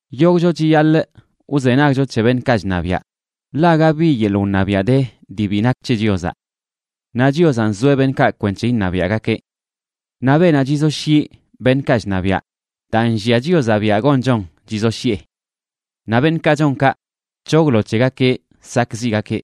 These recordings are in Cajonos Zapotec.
Yogꞌcho chiyaḻꞌ wzenagcho c̱he beṉꞌkaꞌ chṉabiaꞌ, ḻaꞌ aga bi yeḻꞌ wṉabiaꞌ de dii bi nak c̱he Chiozaꞌ. Naꞌ Chiozaꞌ nzoeꞌ beṉꞌkaꞌ kwenc̱he iṉabiaꞌgakeꞌ. Naꞌ beenaꞌ chizoshyiꞌ beṉꞌkaꞌ chṉabiaꞌ, daa nllia Chiozaꞌ biaꞌ gonchon chizoshyiꞌe. Naꞌ beṉꞌkaꞌ chon kaꞌ, c̱hoglo c̱hegakeꞌ sakꞌziꞌgakeꞌ.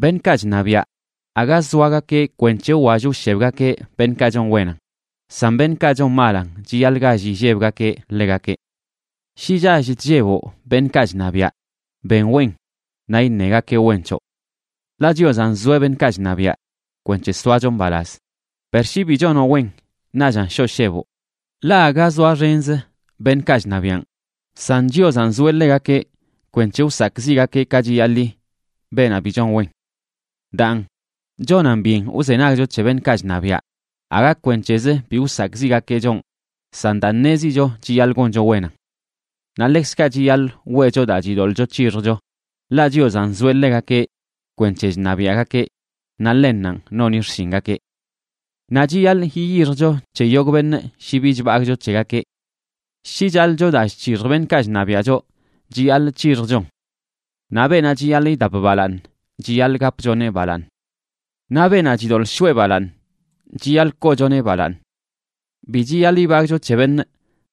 Beṉꞌkaꞌ chṉabiaꞌ, aga zoagakeꞌ kwenc̱he wwall wshebgakeꞌ beṉꞌkaꞌ chon wenan, san beṉꞌkaꞌ chon malan chiyaḻꞌ gall illebgakeꞌ ḻegakeꞌ. Shi chall chlleboꞌ beṉꞌkaꞌ chṉabiaꞌ, ben wen, naꞌ iṉegakeꞌ wen c̱hoꞌ. Ḻaꞌ Chiozaꞌ nzoeꞌ beṉꞌkaꞌ chṉabiaꞌ kwenc̱he soacho mbalaz. Per shi bi chonoꞌ wen, naꞌchan shoꞌ sheboꞌ, ḻaꞌ aga zoaxenzə beṉꞌkaꞌ chṉabiaꞌn, san Chiozanꞌ nzoeꞌ ḻegakeꞌ kwenc̱he wsakꞌziꞌgakeꞌ ka chiyaḻi beenaꞌ bi chon wen. Daan, chonan byen wzenagcho c̱he beṉꞌkaꞌ chṉabiaꞌ, aga kwenc̱hezə bi wsakꞌziꞌgakeꞌ chonꞌ, san daa ṉezicho chiyaḻꞌ goncho wenan. Naꞌ ḻekzkaꞌ chiyaḻꞌ weꞌcho daa chidoḻꞌcho c̱hixjcho, ḻaꞌ Chiozaꞌ nzoeꞌ ḻegakeꞌ kwenc̱he chṉabiaꞌgakeꞌ, naꞌ ḻennanꞌ noni xshingakeꞌ. Naꞌ chiyaḻꞌ yiyixjcho c̱he yogꞌ beṉꞌ shi bi chbagꞌcho c̱hegakeꞌ. Shi chaḻꞌcho daa chc̱hixj beṉꞌkaꞌ chṉabiaꞌ choꞌ, chiyaḻꞌ c̱hixjchon. Naꞌ beenaꞌ chiyaḻꞌ idap balaaṉ, chiyaḻꞌ gapchoneꞌ balaaṉ. Naꞌ beenaꞌ chidoḻꞌ shoꞌe balaaṉ, chiyaḻꞌ koochoneꞌ balaaṉ. Bi chiyaḻꞌ ibagꞌcho c̱he beṉꞌ,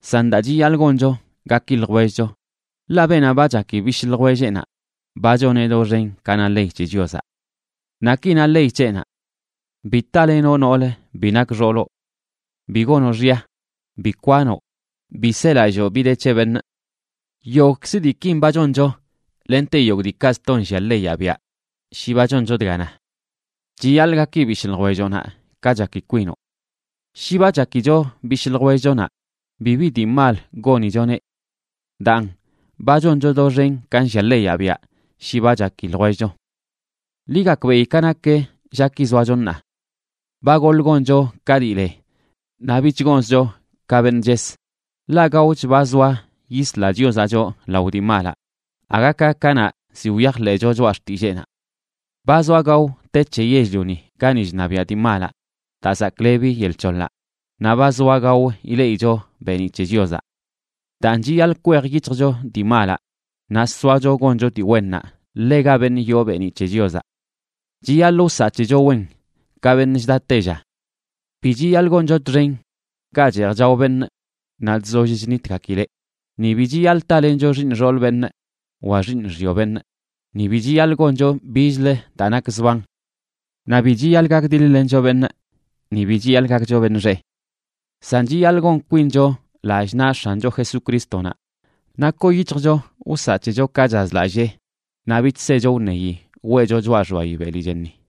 san daa chiyaḻꞌ goncho gaki ljwellcho, ḻaꞌ beenaꞌ ba chaki bishꞌ ljwelleꞌnaꞌ ba choneꞌ doxen ka na ley c̱he Chiozaꞌ. Naꞌ ki na ley c̱heꞌnaꞌ: “Bi talenoꞌ nool bi nak xooloꞌ. Bi gonoꞌ xya. Bi kwanoꞌ. Bi selalloo bi de c̱he beṉꞌ.” Yogꞌkzə diikin ba choncho lente yogꞌ diikaꞌ sto nllia leyaꞌ biaꞌ shi ba choncho dga na: “Chiyaḻꞌ gaki bishꞌ ljwelloꞌnaꞌ ka chaki kwinoꞌ.” Shi ba chakicho bishꞌ ljwellchonaꞌ, bibi dii mal gonichoneꞌ. Daan, ba choncho doxen ka nllia leyaꞌ biaꞌ shi ba chaki ljwellcho. Ḻi gakbeꞌi ka nak llaki zoacho ṉaa. Ba goḻꞌ goncho ka dii le naꞌ bich gonzcho ka beṉꞌ ches, ḻaꞌ gaoch ba zoa yisla Chiozaꞌ choꞌ lao dii malaꞌ aga ka kanaꞌ ziꞌ wyajḻeꞌcho choꞌa xtilleenaꞌ. Ba zoa gao te c̱he yell-lioni gani chṉabiaꞌ dii malaꞌ daa zaklebi yel c̱hoḻaꞌ, naꞌ ba zoa gao ileꞌicho beeniꞌ c̱he Chiozaꞌ. Daan, chiyaḻꞌ kwej yic̱hjcho dii malaꞌ naꞌ soacho goncho dii wennaꞌ ḻega beṉꞌ yoo beeniꞌ c̱he Chiozaꞌ. Chiyaḻꞌ wsaꞌ c̱hecho wen, ka beṉꞌ chda tella. Bi chiyaḻꞌ goncho txen ga cheej chao beṉꞌ naꞌ chzoll chnitgakileꞌ, ni bi chiyaḻꞌ talencho xiiṉ xool beṉꞌ wa xiiṉ xyo beṉꞌ, ni bi chiyaḻꞌ goncho bichlə daa nak zban. Naꞌ bi chiyaḻꞌ gakdiḻ-lencho beṉꞌ, ni bi chiyaḻꞌ gakcho beṉꞌ xeꞌ. San chiyaḻꞌ gon kwincho lallꞌ naꞌ X̱ancho Jesucrístonaꞌ naꞌ koo yic̱hjcho wsaꞌ c̱hecho ka chazlallee naꞌ bich secho wṉeyi weꞌcho choꞌa xbayi beli chenni.